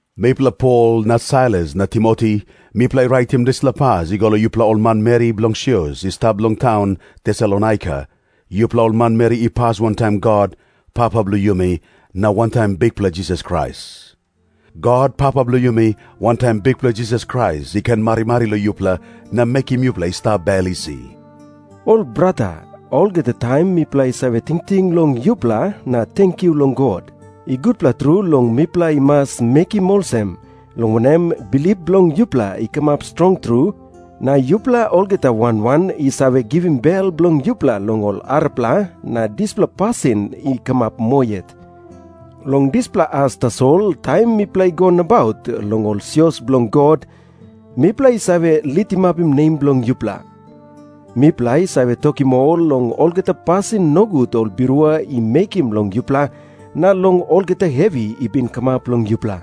Mipela Pol na Sailas na Timoti, mipela i raitim dispela pas i go long yupela ol manmeri bilong sios i stap long taun Tesalonaika, yupela ol manmeri i pas wantaim God, Papa bilong yumi, na wantaim Bikpela Jisas Krais. God, Papa bilong yumi, wantaim Bikpela Jisas Krais i ken marimari long yupela na mekim yupela i stap bel isi. Ol brata, olgeta taim mipela i save tingting long yupela na tenkyu long God. I gutpela tru long mipela i mas mekim olsem, long wanem, bilip bilong yupela i kamap strong tru, na yupela olgeta wan wan i save givim bel bilong yupela long ol arapela, na dispela pasin i kamap moa yet. Long dispela as tasol, taim mipela i go nabaut long ol sios bilong God, mipela i save litimapim nem bilong yupela. Mipela i save tokim ol long olgeta pasin nogut ol birua i mekim long yupela, na long olgeta hevi i bin kamap long yupela.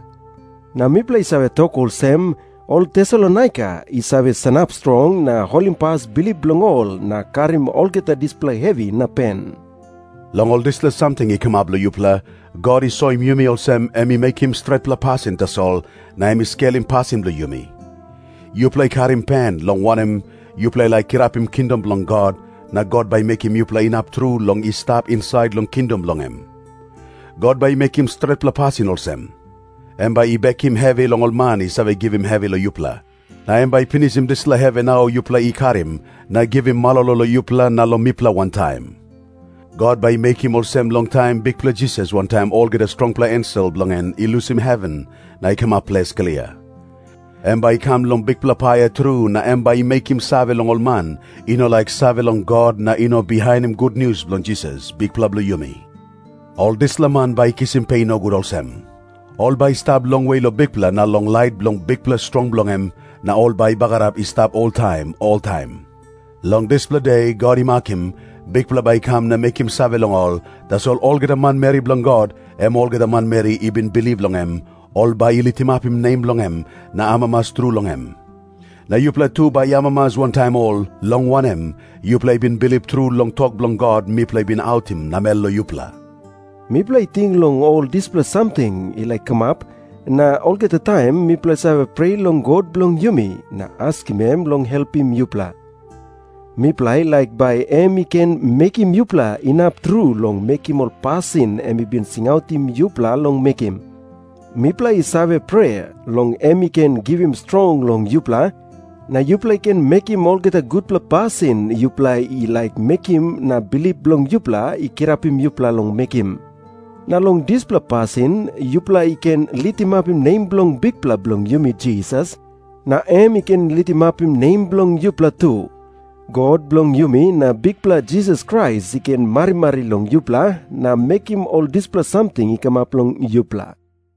Na mipela i save tok olsem, “Ol Tesalonaika i save sanap strong na holimpas bilip bilong ol na karim olgeta dispela hevi na pen.” Long ol dispela samting i kamap long yupela, God i soim yumi olsem, em i mekim stretpela pasin tasol na em i skelim pasin bilong yumi. Yupela i karim pen, long wanem, yupela i laik kirapim kingdom bilong God, na God bai i mekim yupela inap tru long i stap insait long kingdom bilong em. God bai i mekim stretpela pasin olsem. Em bai i bekim hevi long ol man i save givim hevi long yupela. Na em bai i pinisim dispela hevi nau yupela i karim, na givim malolo long yupela na long mipela wantaim. God bai i mekim olsem long taim Bikpela Jisas wantaim olgeta strongpela ensel bilong en i lusim heven na i kamap ples klia. Em bai i kam long bikpela paia tru na em bai i mekim save long ol man i no laik save long God na i no bihainim gutnius bilong Jisas, Bikpela bilong yumi. Ol dispela man bai i kisim pe nogut olsem. Ol bai i stap longwe long Bikpela na long lait bilong bikpela strong bilong em, na ol bai i bagarap i stap oltaim oltaim. Long dispela De God i makim, Bikpela bai i kam na mekim save long ol, tasol olgeta manmeri bilong God, em olgeta manmeri i bin bilip long em, ol bai i litimapim nem bilong em na amamas tru long em. Na yupela tu bai i amamas wantaim ol, long wanem, yupela i bin bilip tru long tok bilong God mipela i bin autim namel long yupela. Mipela i ting long ol dispela samting i laik kamap, na olgeta taim mipela i save prea long God bilong yumi na askim em long helpim yupela. Mipela i laik bai em i ken mekim yupela inap tru long mekim ol pasin em i bin singautim yupela long mekim. Mipela i save prea long em i ken givim strong long yupela, na yupela i ken mekim olgeta gutpela pasin yupela i laik mekim na bilip bilong yupela i kirapim yupela long mekim. Na long dispela pasin yupela i ken litimapim nem bilong Bikpela bilong yumi Jisas, na em i ken litimapim nem bilong yupela tu. God bilong yumi na Bikpela Jisas Krais i ken marimari long yupela na mekim ol dispela samting i kamap long yupela.